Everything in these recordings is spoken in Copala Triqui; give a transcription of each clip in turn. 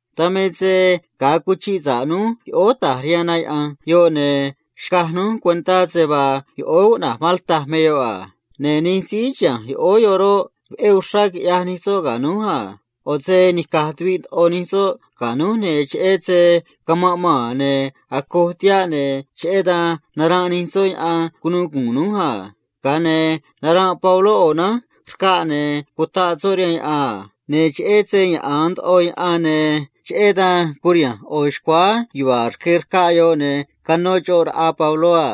Dan me se ga̱a cuchiꞌ sa̱ꞌ núj yoꞌóó ta̱j rihaan na yaꞌa̱nj yoꞌ, ne̱ xcaj núj cuentá se vaa yoꞌóó cuꞌna̱j Malta me yoꞌ a. Ne̱ nij síí chiha̱nj yoꞌóó yoꞌ roꞌ, veꞌé uxrá quiꞌyaj nij soꞌ ga̱ núj a. ꞌO̱ se nica̱j tuviꞌ ndoꞌo nij soꞌ ga̱ núj, ne̱ cheꞌé se camanꞌ maa̱n ne̱ acoj tihaꞌ, ne̱ cheꞌé dan naranꞌ nij soꞌ yaꞌan cunu̱u gu̱u̱n núj a. Ga̱a ne̱ naranꞌ Pabló ꞌo̱ nánj rcaꞌ, ne̱ cutaꞌ soꞌ rihaan yaꞌan a. Ne̱ cheꞌé se yaꞌa̱an ndoꞌo yaꞌan, ne̱ cheꞌé dan curiha̱nj ꞌo̱ xcuáá yuva̱a̱ rque rcaꞌ yoꞌ, ne̱ canó xoꞌ raꞌa Pabló a.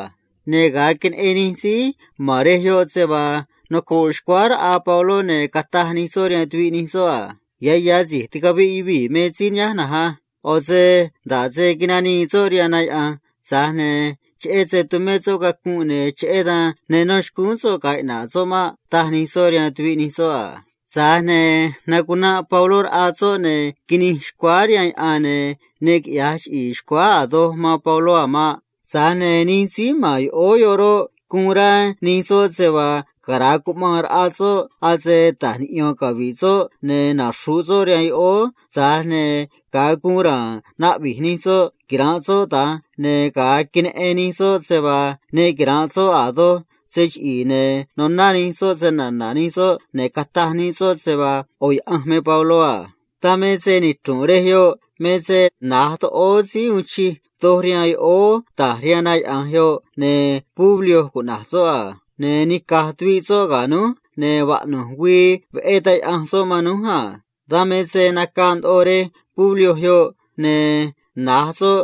Ne̱ ga̱a queneꞌen nij síí ma̱n rej yoꞌ se vaa noco̱ꞌ xcuáá raꞌa Pabló, ne̱ cataj nij soꞌ rihaan tuviꞌ nij soꞌ a: ―Ya̱ ya̱ si̱j ticaviꞌ yuvii̱ me síí nihánj na̱nj á. ꞌO̱ se nda̱ꞌ se nanii soꞌ rihaan na yaꞌa̱nj, tza̱j ne̱ cheꞌé se tumé soꞌ cacunꞌ, ne̱ cheꞌé dan ne no̱ xcúún soꞌ ga̱a̱ iꞌna̱ꞌ soꞌ maꞌ ―taj nij soꞌ rihaan tuviꞌ nij soꞌ a. Tza̱j ne̱ nacunanꞌ Pabló raꞌa soꞌ, ne̱ quinij xcuáá rihaan yaꞌan, ne̱ ne quiꞌya̱j chiꞌi̱i̱ xcuáá a̱ doj man Pabló a̱ maꞌ. Tza̱j ne̱ nij síí ma̱n yoꞌóó yoꞌ roꞌ, guun rá nij soꞌ se vaa cara̱a cuꞌmaan raꞌa soꞌ, ase ta̱j niꞌyo̱n cavi̱ꞌ soꞌ ne̱ naxru̱ꞌ soꞌ rihaan yoꞌóó a. Tza̱j ne̱ ga̱a guun ra̱a̱n naꞌvi̱j nij soꞌ quira̱nꞌ soꞌ da̱nj, ne̱ ga̱a queneꞌen nij soꞌ se vaa ne quira̱nꞌ soꞌ a̱ doj se chiꞌi̱i̱, ne̱ noná nij soꞌ snana̱ nij soꞌ, ne̱ cataj nij soꞌ se vaa ꞌo̱ yaꞌanj me Pabló a. Dan me se nichru̱nꞌ rej yoꞌ me se na̱j toꞌóó síí uun chij doj rihaan yoꞌóó ta̱j rihaan na yaꞌa̱nj yoꞌ, ne̱ Publio cuꞌna̱j soꞌ a. Ne̱ nica̱j tuviꞌ soꞌ ga̱ núj, ne̱ vaꞌnu̱j güii veꞌé taj yaꞌanj soꞌ man núj a. Dan me se nacaa ndoꞌo rej síí cuꞌna̱j Publio, ne̱ na̱j soꞌ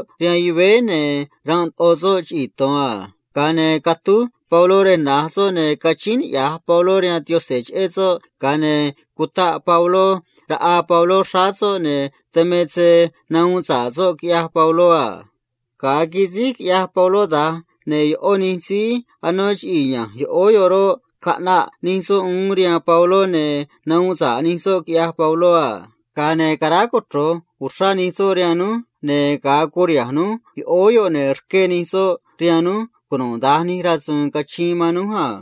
ranꞌ ndoꞌo soꞌ chiꞌii̱ to̱n a. Ga̱a ne̱ catúj Pabló rej na̱j soꞌ, ne̱ cachíín niꞌya̱j Pabló rihaan Yaꞌanj cheꞌé soꞌ a. Ga̱a ne̱ cutaꞌ Pabló raꞌa Pabló xráá soꞌ, ne̱ dan me se nahuun sa̱ꞌ soꞌ, quiꞌyaj Pabló a. Ga̱a quisíj quiꞌyaj Pabló da̱nj, ne̱ ꞌó nij síí anó chiꞌii̱ ya̱nj yoꞌóó yoꞌ roꞌ, caꞌnaꞌ nij soꞌ uún rihaan Pabló, ne̱ nahuun sa̱ꞌ nij soꞌ, quiꞌyaj Pabló a. Ga̱a ne̱ caráj cochro̱j uxrá nij soꞌ man núj, ne̱ ga̱a curiha̱nj núj yoꞌóó yoꞌ, ne̱ rqué nij soꞌ rihaan núj cunuda̱nj nij rasu̱u̱n cachiin man núj a.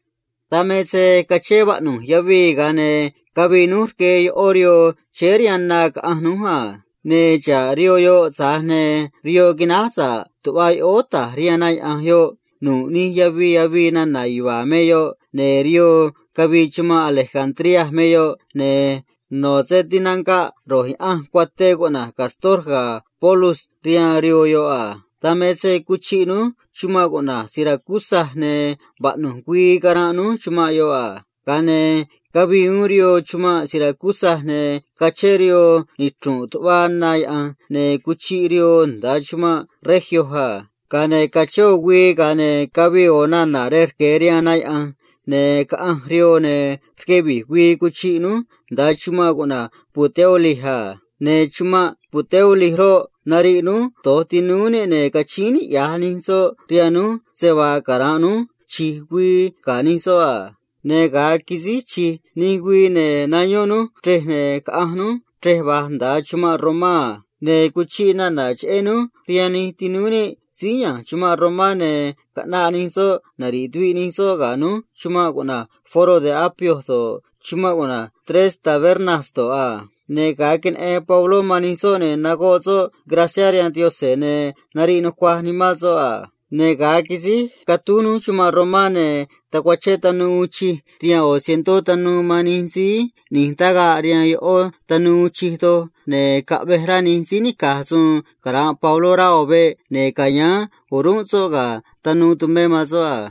Dan me se cachén vaꞌnu̱j yavii, ga̱a ne̱ cavii núj rque ꞌó rihoo chéé rihaan na caꞌanj núj a. Ne̱ xa̱ꞌ rihoo yoꞌ, tza̱j ne̱ rihoo quináj sa̱ꞌ tuꞌva yoꞌóó ta̱j rihaan na yaꞌa̱nj yoꞌ nu̱ꞌ nij yavii avii nana̱ yuva̱a̱ me yoꞌ a. Ne̱ rihoo cavii chumanꞌ Alejandría me yoꞌ, ne̱ no̱ se tinanga̱ꞌ ro̱j yaꞌanj cuaté cuꞌna̱j Cástor ga̱ Pólux rihaan rihoo yoꞌ a. Dan me se cuchiꞌ núj chumanꞌ cuꞌna̱j Siracusa, ne̱ vaꞌnu̱j güii caranꞌ núj chumanꞌ yoꞌ a. Ga̱a ne̱ cavii uún rihoo chumanꞌ Siracusa, ne̱ cachén rihoo nichru̱nꞌ tuꞌva na yaꞌa̱nj, ne̱ cuchiꞌ rihoo nda̱a chumanꞌ Regio a. Ga̱a ne̱ cachén ꞌo̱ güii, ga̱a ne̱ cavii ꞌo̱ nana̱ rej sur rihaan na yaꞌa̱nj, ne̱ caꞌanj rihoo, ne̱ rque vi̱j güii cuchiꞌ núj nda̱a chumanꞌ cuꞌna̱j Puteoli a. Ne̱ chumanꞌ Puteoli roꞌ, nariꞌ núj do̱j tinúú níꞌ, ne̱ cachíín niꞌya̱j nij soꞌ rihaan núj se vaa cara̱nꞌ núj chi̱j güii ga̱ nij soꞌ a. Ne̱ ga̱a quisíj chi̱j nij güii, ne̱ nayón núj chrej, ne̱ caꞌanj núj chrej va̱j nda̱a chumanꞌ Romá a. Ne̱ cuchiꞌ nana̱ cheꞌé núj rihaan nij tinúú níꞌ síí ya̱nj chumanꞌ Romá, ne̱ caꞌnaꞌ nij soꞌ nari̱ꞌ tuviꞌ nij soꞌ ga̱ núj chumanꞌ cuꞌna̱j Foro de Apio do̱ꞌ, chumanꞌ cuꞌna̱j Tres Tabernas do̱ꞌ a. Ne̱ ga̱a queneꞌen Pabló man nij soꞌ, ne̱ cataj soꞌ guun niꞌya̱j níꞌ rihaan Yaꞌanj, ne̱ nariꞌ nucuaj nimán soꞌ a. Ne̱ ga̱a quisíj catúj núj chumanꞌ Romá, ne̱ tacuachén tanuu capitán ꞌni̱j raꞌa cientó tanuu man nij síí ꞌni̱j tagaꞌ rihaan ꞌó tanuu uun chij doj a. Tza̱j ne̱ caꞌvej rá nij síí nica̱j suun cara̱nꞌ Pabló rá ꞌo̱ veꞌ ca̱yáán o̱rúnꞌ soꞌ ga̱ tanuu tumé man soꞌ a.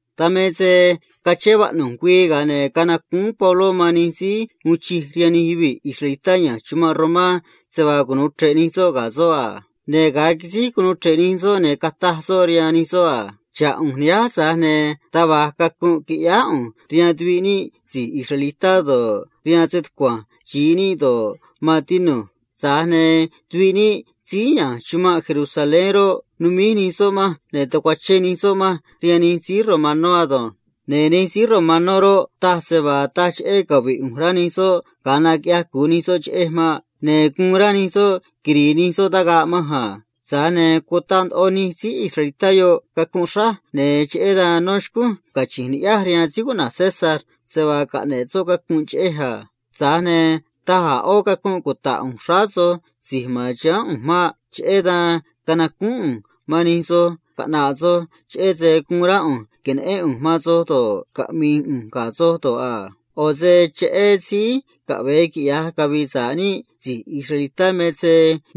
Dan me se cachén vaꞌnu̱j güii, ga̱a ne̱ canacúún Pabló man nij síí uun chij rihaan nij yuvii̱ israelitá ya̱nj chumanꞌ Romá se vaa cunu̱u chre̱ꞌ nij soꞌ ga̱ soꞌ a. Ne̱ ga̱a quisíj cunuu chre̱ꞌ nij soꞌ, ne̱ cataj soꞌ rihaan nij soꞌ a: ―Xa̱ꞌ ꞌu̱nj nihánj, tza̱j ne̱ taj va̱j cacunꞌ quiꞌyáá ꞌu̱nj rihaan tuviꞌ níꞌ si̱j israelitá do̱ꞌ, rihaan stucua̱nj xi̱i níꞌ nij síí ma̱n ga̱a naá do̱ꞌ, maan tinu̱j. Tza̱j ne̱ rej chumanꞌ Jerusalén roꞌ, taꞌaa nii manj ne̱ tacuachén nii manj rihaan nij síí romanó ado̱nj. Ne̱ nij síí romanó roꞌ, taj se vaa taj cheꞌé cavi̱ꞌ ꞌu̱nj rá nij soꞌ ga̱a naquiꞌyaj cu̱u nij soꞌ cheꞌej maꞌ. Ne̱ guun rá nij soꞌ quiri̱i̱ nij soꞌ tagaꞌ manj a. Tza̱j ne̱ cutaꞌ ndoꞌo nij síí israelitá yoꞌ cacunꞌ xráj, ne̱ cheꞌé dan no̱ xcúnj cachi̱nj ni̱ꞌyáj rihaan emperador cuꞌna̱j César se vaa caꞌne̱ꞌ soꞌ cacunꞌ cheꞌej a. Tza̱j ne̱ taj a̱ ꞌó cacunꞌ cuta̱ꞌ ꞌu̱nj xráá soj si̱j ma̱n chiháán ꞌu̱nj maꞌ. Cheꞌé dan canacúún ꞌu̱nj man nij soj caꞌna̱ꞌ soj, cheꞌé se guun rá ꞌu̱nj que̱neꞌén ꞌu̱nj man soj do̱ꞌ, caꞌmi̱i̱ ꞌu̱nj ga̱ soj do̱ꞌ a. ꞌO̱ se cheꞌé síí naꞌvi̱j níꞌ síí caꞌve̱e quiꞌya̱j cavi̱i̱ sa̱ꞌ níꞌ si̱j israelitá roꞌ, me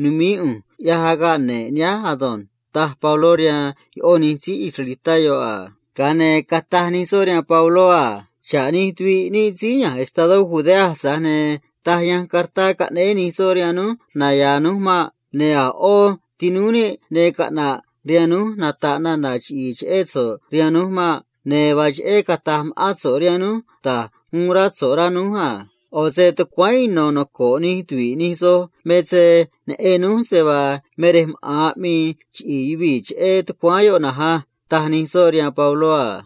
nu̱mií ꞌu̱nj agaꞌ ne̱ꞌ nihánj ado̱nj ―taj Pabló rihaan ꞌó nij síí israelitá yoꞌ a. Ga̱a ne̱ cataj nij soꞌ rihaan Pabló a: ―Xa̱ꞌ nij tuviꞌ níꞌ síí ya̱nj estadó Judea, tza̱j ne̱ taj yanj cartá caꞌnéé nij soꞌ rihaan núj cheꞌé so̱ꞌ naya̱a̱ núj maꞌ. Ne̱ a̱ ꞌó tinúú níꞌ ne caꞌna̱ꞌ rihaan núj nata̱ꞌ nana̱ chiꞌi̱i̱ cheꞌé so̱ꞌ rihaan núj maꞌ. Ne̱ vaa cheꞌé cata̱j ma̱ꞌán so̱ꞌ rihaan núj da̱j uun rá so̱ꞌ, rá núj a. ꞌO̱ se tucuáán ino̱ noco̱ꞌ nij tuvi̱ꞌ nij soj me se neꞌen núj se vaa me rej maꞌa̱n aꞌmii chiꞌi̱i̱ yuvii̱ cheꞌé tucuáán yoꞌ na̱nj á ―taj nij soꞌ rihaan Pabló a.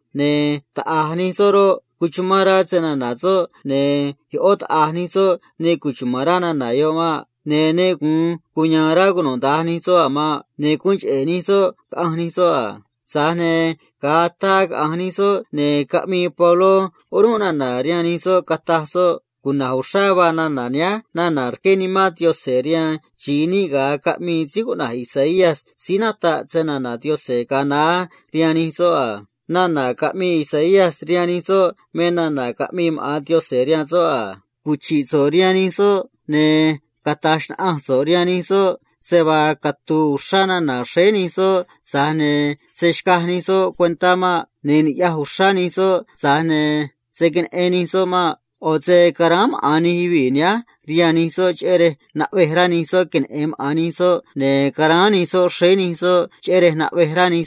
Ne̱ taꞌa̱j nij soꞌ roꞌ, cuchumán rá snana̱ soꞌ, ne̱ ꞌó taꞌa̱j nij soꞌ taj maꞌ. Ne̱ ne gu̱un cuya̱a̱n rá cunuda̱nj nij soꞌ a̱ maꞌ. Ne̱ guun cheꞌe̱ nij soꞌ caꞌanj nij soꞌ a. Tza̱j ne̱ ga̱a ataa caꞌa̱nj nij soꞌ, ne̱ caꞌmii Pabló orúnꞌ nana̱ rihaan nij soꞌ, cataj soꞌ a: ―Cuna̱j uxrá vaa nana̱ nihánj nana̱ rqué Nimán Yaꞌanj rihaan xi̱i níꞌ ga̱a caꞌmii síí cuꞌna̱j Isaías síí nataꞌ snana̱ Yaꞌanj ga̱a naá rihaan nij soꞌ a. Ne̱ nihánj me nana̱ yoꞌ a: Caꞌa̱nj so̱ꞌ rihaan nij yuvii̱ yoꞌ, ne̱ cata̱j xnaꞌanj so̱ꞌ rihaan nij soꞌ a: “Catu̱u̱ uxrá nana̱ xréé nij soꞌ, tza̱j ne̱ se̱ xcaj nij soꞌ cuentá maꞌ. Ne̱ ni̱ꞌyaj uxrá nij soꞌ, tza̱j ne̱ se̱ queneꞌen nij soꞌ maꞌ. ꞌO̱ se guun nichra̱j rá nimán nij yuvii̱ nihánj ado̱nj. Caráán maꞌa̱n nij soꞌ rihaan nij soꞌ cheꞌé rej se̱ queneꞌen maꞌa̱n nij soꞌ, ne̱ caráán nij soꞌ xréé nij soꞌ, cheꞌé rej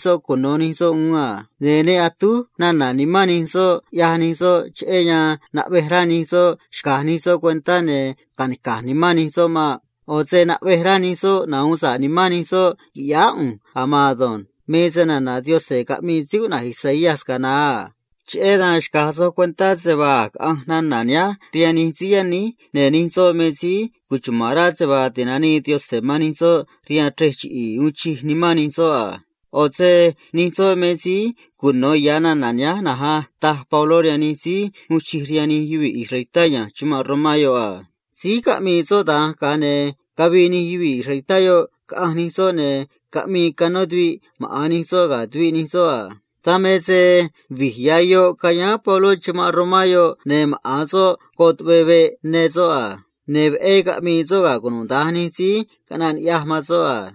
se̱ cuno nij soꞌ uún a̱ maꞌ. Ne̱ ne atúj nana̱ nimán nij soꞌ, ꞌyaj nij soꞌ, cheꞌé rej se̱ xcaj nij soꞌ cuentá ne̱ ca̱nica̱j nimán nij soꞌ maꞌ. ꞌO̱ se naꞌvej rá nij soꞌ nahu̱un sa̱ꞌ nimán nij soꞌ qui̱ꞌyáá ꞌu̱nj a̱ maan ado̱nj.” Nana̱ yoꞌ me snana̱ Yaꞌanj caꞌmii síí cuꞌna̱j Isaías ga̱a naá a. Cheꞌé dan xca̱j soj cuentá se vaa a̱j caꞌanj nana̱ nihánj rihaan nij síí yaníj, ne̱ nij soꞌ me síí cuchuma̱n rá se vaa ti̱nanii Yaꞌanj man nij soꞌ rihaan sayuun ne̱ cavi̱i̱ sa̱ꞌ nij soꞌ a. ꞌO̱ se nij soꞌ me síí cuno̱ ya̱ nana̱ nihánj na̱nj á ―taj Pabló rihaan nij síí uun chij rihaan nij yuvii̱ israelitá ya̱nj chumanꞌ Romá a. Síj caꞌmii soꞌ da̱nj, ga̱a ne̱ cavii nij yuvii̱ israelitá yoꞌ caꞌanj nij soꞌ, ne̱ caꞌmii canó tuviꞌ maꞌa̱n nij soꞌ ga̱ tuviꞌ nij soꞌ a. Dan me se vi̱j ya̱ yoꞌ cayáán Pabló chumanꞌ Romá yoꞌ, ne̱ maꞌa̱n soꞌ goꞌ tuꞌvee veꞌ ya̱nj soꞌ a. Ne̱ veꞌé caꞌmii soꞌ ga̱ cunuda̱nj nij síí caꞌnaꞌ ni̱ꞌyaj man soꞌ a.